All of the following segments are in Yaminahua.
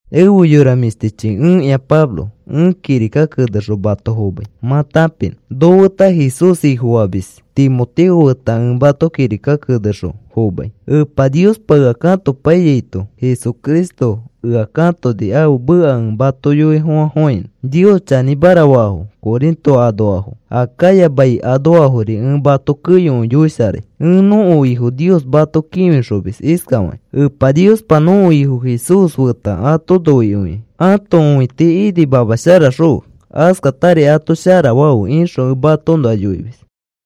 Ẽfe yora mĩshtichi, ẽkĩa Pablo. Ẽ kirika kenexõ mato fomai mã tãpinõ. Nofeta Jesús Ifofamis Timoteo feta ẽ mato kirika kenexõ fomai. Epa Niospa ea katopaiyaito Cristo Jesús ea katoni ãfe meka ẽ mato yoifofãfofãinõ. Nios chanĩmara faafo Corinto anoafo, Acaya mai anoafori ẽ mato keyokõi yoisharai. Ẽ nõko Nios mato kĩfixomis iskafakĩ: “Epa Niospa, nõko Ifo Jesús feta ato noikõikĩ ãto õiti inimamasharaxõfe. Askatari ato shara fafe,” ixõ ẽ matoõnoa yoimis.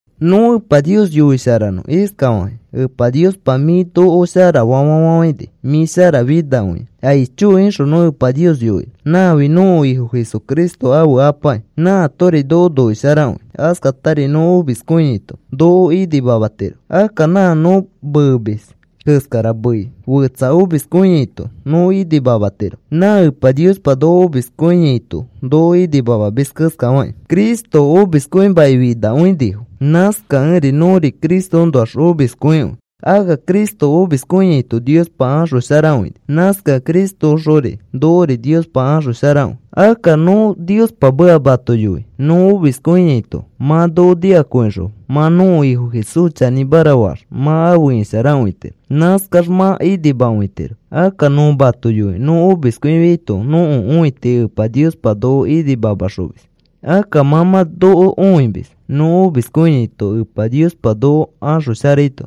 Nõ Epa Nios yoisharanõ iskafakĩ: “Epa Niospa, mĩ noko sharafa fafafãini. Mĩ sharafinakõia. ¡Aicho!” ixõ nõ Epa Nios yoinõ. Nãfi nõko Ifo Jesucristo ãfe Apaki. Nãatori noko noisharakõi. Askatari nõ omiskõiaito noko inimamatiro. Akka nã nõ meemis keskara mei, fetsa omiskõiaito nõ inimamatiro, nã Epa Niospa nõ omiskõiaito noko inimamamis keskafakĩ. Cristo omiskõimakĩfinakõinifo. Nãskakẽri nõri Cristoõnoax omiskõikõi. Akka Cristo omiskõiaito Niospa axosharakõini. Nãskakẽ Cristoõxori nokori Niospa axosharakõi. Akka nõ Niospa meka mato yoi nõ omiskõiaito mã noko nikakõixõ mã nõko Ifo Jesús chanĩmara faax mã afe isharakõitiro. Nãskax mã inimakõitiro. Akka nõ mato yoi nõ omiskõifiaito nõko õiti Epa Niospa noko inimamaxomis. Akka mã mã noko õimis nõ omiskõiaito Epa Niospa noko axosharaito.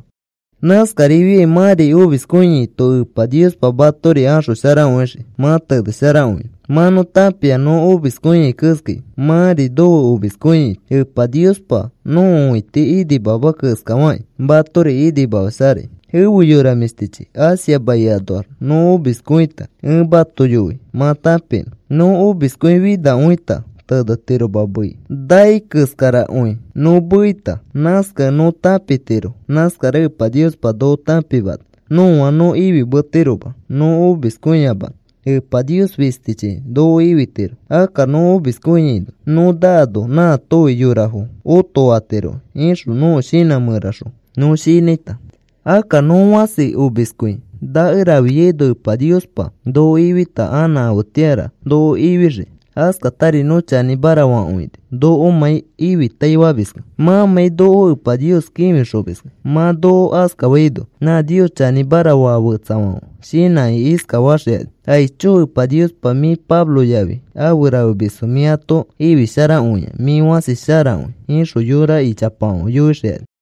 Nãskarifiai mãri omiskõiaito Epa Niospa matori axosharakõixii mã tenesharakõinõ. Mã nõ tãpia nõ omiskõiai keskai mãri nofe omiskõiaito Epa Niospa nõko õiti inimama keskafakĩ matori inimamasharai. Efe yora mĩshtichi, Asia mai anoax nõ omiskõita ẽ mato yoi mã tãpinõ. Nõ omiskõifinakõita tenetiroma mei nai keskarakõi nõ meita. Nãskakẽ nõ tãpitiro nãskara Epa Niospa noko tãpimana nõa nõ ifimetiroma nõ omiskõiyamanõ. Epa Nios fistichi noko ifitiro. Akka nõ omiskõiaino nõ naano, nãatofi yorafo otofatirokĩ, ixõ nõko shinã mẽraxõ nõ shinãita. Akka nõ fãsi omiskõi nakerafiaino Epa Niospa noko ifita. Anã afetĩara noko ifixii. Askatari nõ chanĩmara fakõini nokomãi ifitaifamiskẽ, mãmãi noko Epa Nios kĩfixomiskẽ. Mã noko askafaino nã Nios chanĩmara faa fetsafãfe shinãkĩ iskafaxikani: “Aicho Epa Niospa, mĩ Pablo yafi afe rafemisfo mĩ ato ifisharakõia. Mĩ fãsi sharakõi,” ixõ yora ichapafãfe yoixikani.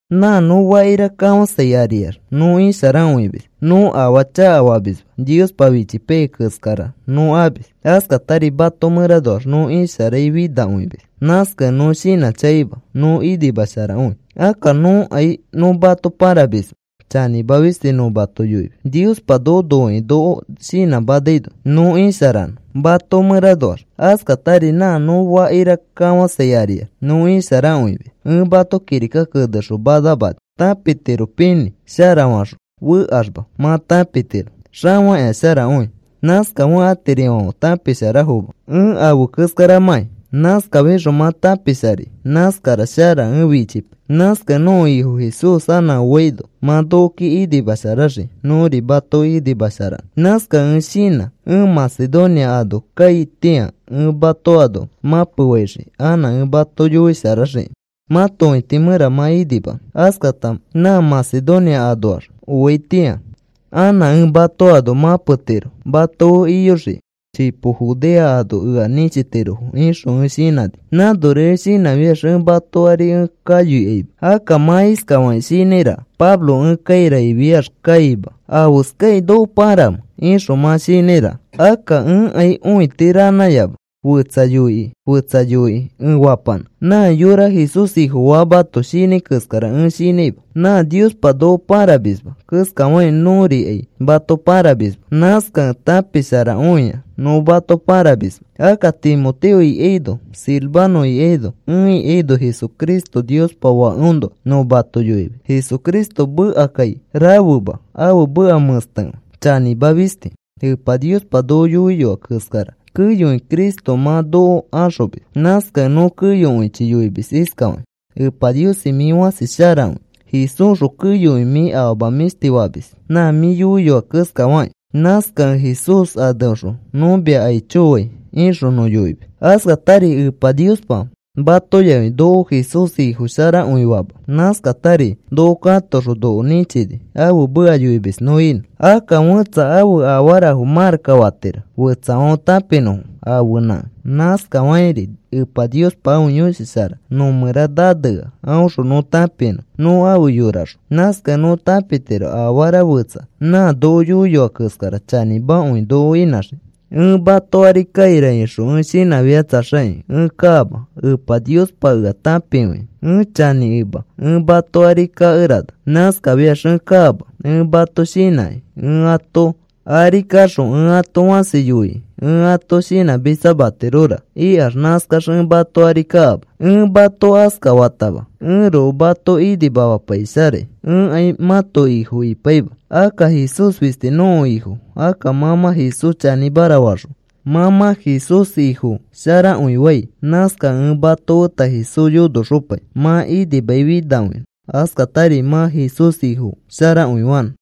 Nã nõ fakira kafãsai ariax nõ isharakõimis, nõ afaa chakafamisma. Niospa fichipaiyai keskara nõ amis. Askatari mato mẽranoax nõ isharaifinakõimis. Nãskakẽ nõ shinãchakaima nõ inimasharakõi. Akka nõkai nõ mato pãramisma, chanĩma fisti nõ mato yoimis. Niospa noko noikĩ noko shinãmanaino nõ isharanõ mato mẽranoax. Askatari nã nõ fakira kafãsai ariax nõ isharakõimis. Ẽ mato kirika kenexõ manamani tãpitiropinĩ shara faxõ fekaxma mã tãpitiro xafakĩa sharakõi. Nãskafekẽ atirifãfe tãpisharafoma ẽ afe keskaramãki. Nãskafixõ mã tãpisharai, nãskara shara ẽ fichipai. Nãskakẽ nõko Ifo Jesús anã oaino mã nokoki inimasharaxii, nõri matoki inimasharanõ. Nãskakẽ ẽ shinã ẽ Macedonia ano kaitĩa ẽ mato ano mãpefaixii anã ẽ mato yoisharaxiki mãto õiti mẽra mã inimanõ. Askata nã Macedonia anoax ẽ oaitĩa anã ẽ mato ano mãpetiro mato fe iyoxiki. Chipo Judea ano ea nĩchitirofo, ixõ ẽ shinãni. Nãnori ẽ shinãfiax ẽ mato ari ẽ kayoikaima. Akka mã iskafakĩ shinãiraka: “Pablo ẽ kaira ifiax kaima, ¿afeskakĩ noko pãramẽ?” ixõ mã shinãiraka. Akka ẽkai õiti ranãyama fetsa yoikĩ, fetsa yoikĩ ẽ fapanã. Nã yõra Jesús Ifofaamato shinãi keskara ẽ shinãima. Nã Niospa noko pãramisma keskafakĩ nõrikai mato pãramisma. Nãskakẽ tãpisharakõia nõ mato pãramisma. Akka Timoteo ikaino Silvano ikaino ẽ ikaino Jesucristo Niospa Fakeõnoa nõ mato yoimis. Jesucristo mekakai rafema, ãfe meka mẽstekõi. Chanĩma fisti. Epa Niospa noko yoiyoa keskara keyokõi Cristo mã noko axomis. Nãskakẽ nõ keyokõichi yoimis iskafakĩ: “Epa Niosi, mĩ fãsi sharakõi. Jesúsxõ keyokõi mĩ afama mĩshti famis nã mĩ yoiyoa keskafakĩ. Nãskakẽ Jesús aneõxõ nõ mia aicho fai,” ixõ nõ yoimis. Askatari Epa Niospa mato yafi noko Jesús Ifosharakõifama. Nãskatari noko katoxõ noko nĩchini ãfe meka yoimis nõ inõ. Akka fẽtsa ãfe afarafo marakka fatiro fetsafãfe tãpinõfo ãfenãkẽ. Nãskafakĩri Epa Niospa ãfe Yõshi Shara nõ mẽra nanea aõxõ nõ tãpinõ nõ afe yoraxõ. Nãskakẽ nõ tãpitiro afara fetsa nã noko yoiyoa keskara chanĩmakõi noko inãxii. Ẽ mato ari kaira ixõ ẽ shinãfiitaxakĩ ẽ kaama. Epa Niospa ea tãpikõia ẽ chanĩkẽma. Ẽ mato ari kakerana. Nãskafiax ẽ kaama ẽ mato shinãkĩ. Ẽ ato ari kaxõ ẽ ato fasi yoikĩ ẽ ato shinãmitsamatirora ikax nãskax ẽ mato ari kaama. Ẽ mato askafatama ẽroko mato inimamapaisharai. Ẽkai mãto ifo ipaima. Akka Jesús fisti nõko Ifo. Akka mã mã Jesús chanĩmara faxõ mã mã Jesús Ifo sharakõifai. Nãskakẽ ẽ mato feta Jesús yonoxopai mã inimai finakõinõ, askatari mã Jesús Ifo sharakõifanõ.